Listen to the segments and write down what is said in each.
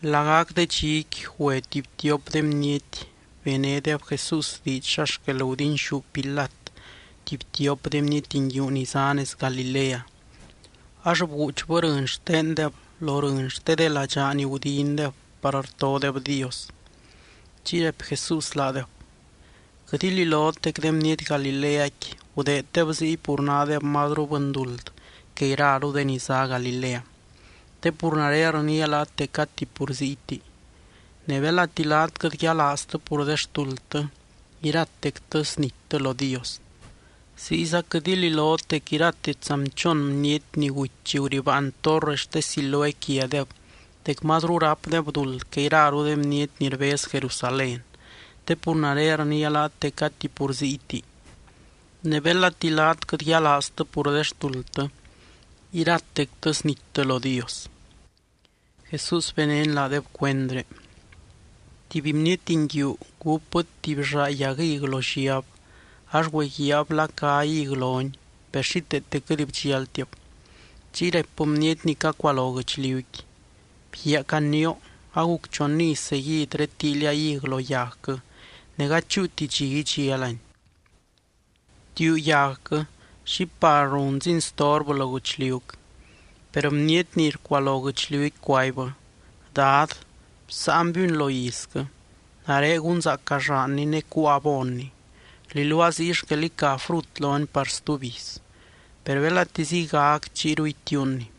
Lagac de dxiqui, güe tuby tiop de bniety benédeb Jesús diidx xa xquel gudinxú Pilat tuby tiop de bniety nguiu ni zá nez Galilea, ax bguuchbɨ rɨny xtendeb lo rɨny xte de ladxaa ni gudindeb par rtodeb Dios. Chiy raipy Jesús laadeb: —Quɨt ililot dec de bniety Galileaqui gudeeddeb ziy pur nádeb mazru bɨnduld que iraru de ni zá Galilea, te pur nare rniia laat dec gati pur ziyti. Ne belati laat quɨt yialaaztɨ pur de xtuldtɨ, iratectɨ snittɨ lo Dios. Ziyza quɨt ililot dec irate tsanbchon bniety ni guty chi guribaan torre xte Siloé quiadeb dec mazru rápdeb duld que iraru de bniety ni rbez Jerusalén, te pur nare rniia laat dec gati pur ziyti. Ne belati laat quɨt yialaaztɨ pur de xtuldtɨ, iratectɨ snittɨ lo Dios. Jesús benény laadeb cuendré: —Tuby bniety nguiu gúpbɨ tuby llaa yag hig lo lliab, ax güeguiaab la cá hig loni. Per xíteete quɨt bdxialtib. Chiy raipbɨ bniety ni cacualo guɨchliuqui: “Bguiaa, canioo, aguc chon iz seguid redtíilia hig lo yagquɨ, ne gady chúuti dxi idxialani. Btiuu yagquɨ. ¿Xi par runzini storbɨ lo guɨchliuc?” Per bniety ni rcualo guɨchliuqui cuaibbɨ: “Dad, bsáanbiuni lo izquɨ. Nare gunzaaca llaanni ne cuua abonni. Rliluaa ziy xquel ica frut loni par stuby iz. Per belati ziygac, chiyru itiuunni.”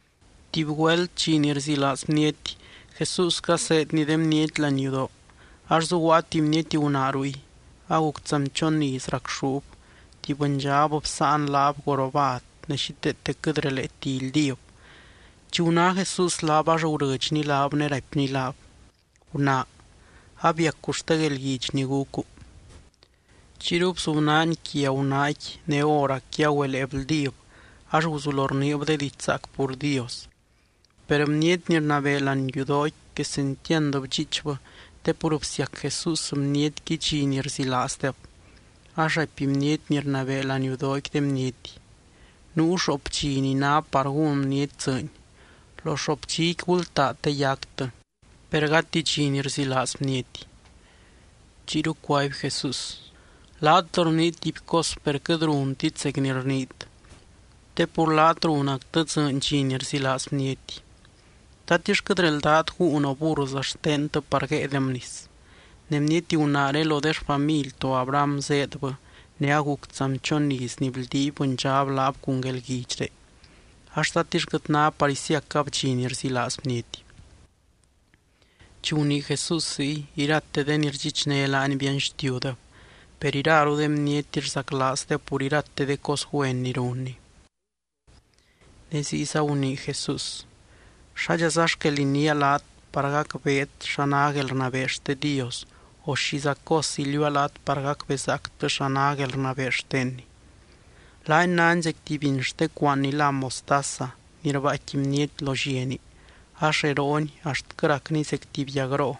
Tuby güelt, dxi ni rzilaaz bniety, Jesús caseedny de bniety láani yudoo ax zuguaa tuby bniety gunaa ruy. Aguc tsanbchon iz racxúb. Tuby bɨndxab bsáan laab jorobad ne xíteete quɨt releeti ildíb. Chi guná Jesús laab, ax gurɨdxny laab ne raipny laab: —Gunaa, abiacu xte guelguidx ni gucu. Chiyru bzubnaany quia gunaaqui ne hóracqui agüelee bldíb ax guzulo rniib de diidx zaac pur Dios. Per bniety ni rnabee láani yudooqui, quesentiand bdxiichbɨ te pur bsiac Jesús bnietqui dxi ni rzilaazdeb, ax raipy bniety ni rnabee láani yudooqui de bniety: —Nuu xoop dxi ni ná par gún bniety dzɨɨny. Lo xoop dxiqui gultaa te yactɨ, per gati dxi ni rzilaaz bniety. Chiyru cuaby Jesús: —Laat rniit tuby cos per quɨt runtit zec ni rniit. Te pur laat runactɨ dzɨɨny dxi ni rzilaaz bniety. ¿Tatix quɨt reldát gúun o burrza xtentɨ par guéedem nis? Ne bniety gunaaré lo de xfamily to Abraham zéedbɨ ne aguc tsanbchon iz ni bldiiby bɨndxab laab cun guelguidxré ax, ¿tatix quɨt ná par isiacab dxi ni rzilaaz bniety? Chi gunii Jesús ziy, irate de ni rdxichné laany bianxtiudeb. Per iraru de bniety rzaclaazdeb pur irate de cos güen ni runny. Ne ziyza gunii Jesús: —¿Xádxaza xquel iniia laat par gacbeet xa ná guelrnabee xte Dios, o xiza cos iliuua laat par gacbezaactɨ xa ná guelrnabee xtenny? Laani náni zec tuby biny xte cuaan ni lá mostaza ni rbaaicqui bniety lo lliani, ax rerooni axtquɨ racni zec tuby yagroo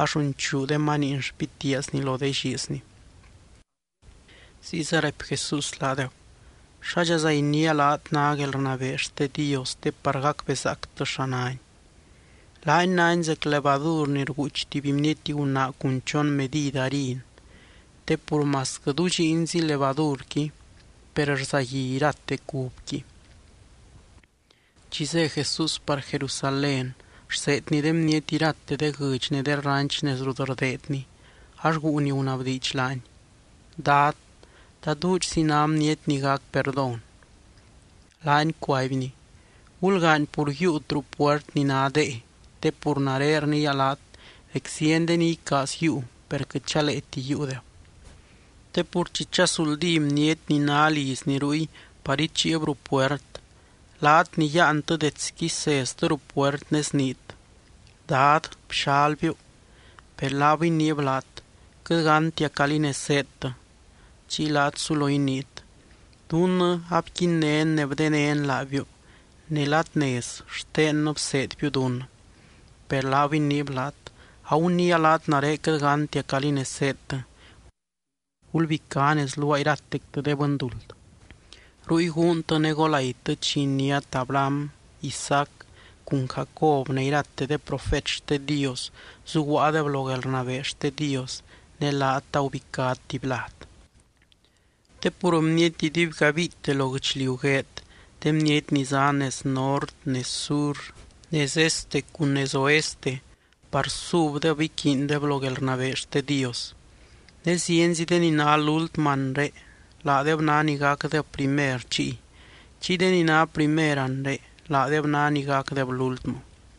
ax runchuu de maniin xpitiaazni lo de llizni. Ziyza raipy Jesús laadeb: —¿Xádxaza iniia laat ná guelrnabee xte Dios te par gacbezaactɨ xa náni? Laani náni zec levadur ni rguuch tuby bniety gunaa cun chon medid harin te pur masquɨ dudxiinzi levadurqui, per rzagui irate cubqui. Chi zé Jesús par Jerusalén, rseedny de bniety irate de guɨdx ne de ranch nez rut rdeedny, ax guu ni gunabdiidx laany: —Dad, ¿ta duudxzi ná bniety ni gac perdón? Laany cuaibny: —Gulgaany pur yiiut ruu puert ni ná dee te pur nare rniia laat dec zieny de ni icaaz yiiu, per quɨt chaleeti yiiudeb. Te pur chi chazuldí bniety ni ná lizni ruy par ichiib ruu puert, laat ni yáantɨ detsqui seztɨ ruu puert ne sniit: “Dad, bxalbiu.” Per laab iniib laat: “Quɨt gántia calí nez zéedtɨ.” Chiy laat sulo iniit: “Dunnɨ abquinnén ne bdenén laabiu, ne ladnez xtennɨ bseedbiu dunnɨ.” Per laab iniib laat: “Aguniia laat, nare quɨt gántia calí nez zéedtɨ. Gulbicá nez luaa iratectɨ de bɨnduld.” Ruy guuntɨ ne golaitɨ chi iniát Abraham, Isaac cun Jacob ne irate de profet xte Dios zuguaadeb lo guelrnabee xte Dios, ne laat agubicát tuby lad. Te pur bniety idubygabiite lo guɨchliu gueed, de bniety ni zá nez nort, nez sur, nez este cun nez oeste par subdeb iquiindeb lo guelrnabee xte Dios. Ne zienzi de ni ná lúltmɨ anre, laadeb ná ni gacdeb primer chiy. Chiy de ni ná primer anre, laadeb ná ni gacdeb lúltmɨ.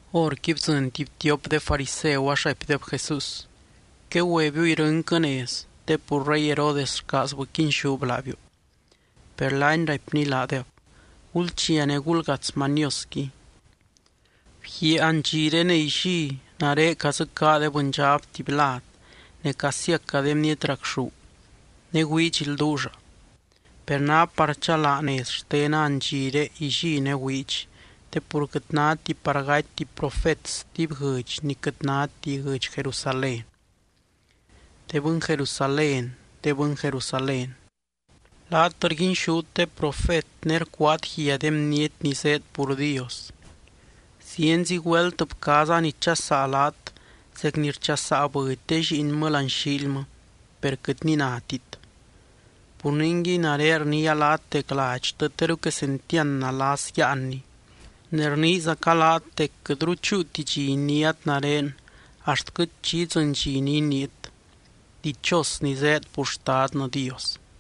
Horqui bdzɨny tuby tiop de fariseu ax raipdeb Jesús: —Quegüebiu irɨnquɨ nez, te pur rey Herodes rcaazbɨ quinxúb laabiu. Per laany raipny laadeb: —Gulchia ne gulgats maniosqui: “Bguiaa andxiré ne illí nare cadzɨcaa de bɨndxab tuby lad ne casiaca de bniety racxú ne güidx ilduulla.” Per ná par chalaa nez xtena andxiré, illí ne güidx, te pur quɨt náti par gaty tuby profet stuby guɨdx ni quɨt náti guɨdx Jerusalén. ’¡De bɨny Jerusalén, de bɨny Jerusalén, laat rguinxút de profet ne rcuaat guia de bniety ni zéed pur Dios! ¡Zienzi güelt bcaaza nichasaa laat zec ni rchasaa bɨdy de lliinmɨ láani xiilmɨ, per quɨt ni nátit! ’Pur ningui, nare rniia laat dec ladxtɨ teru quesentiand nalas yáanni. Ne rniizaca laat dec quɨtru chúuti dxi iniát nare axtquɨ chi idzɨny dxi ni iniit: “Dichos ni zéed pur Xtadnɨ Dios.”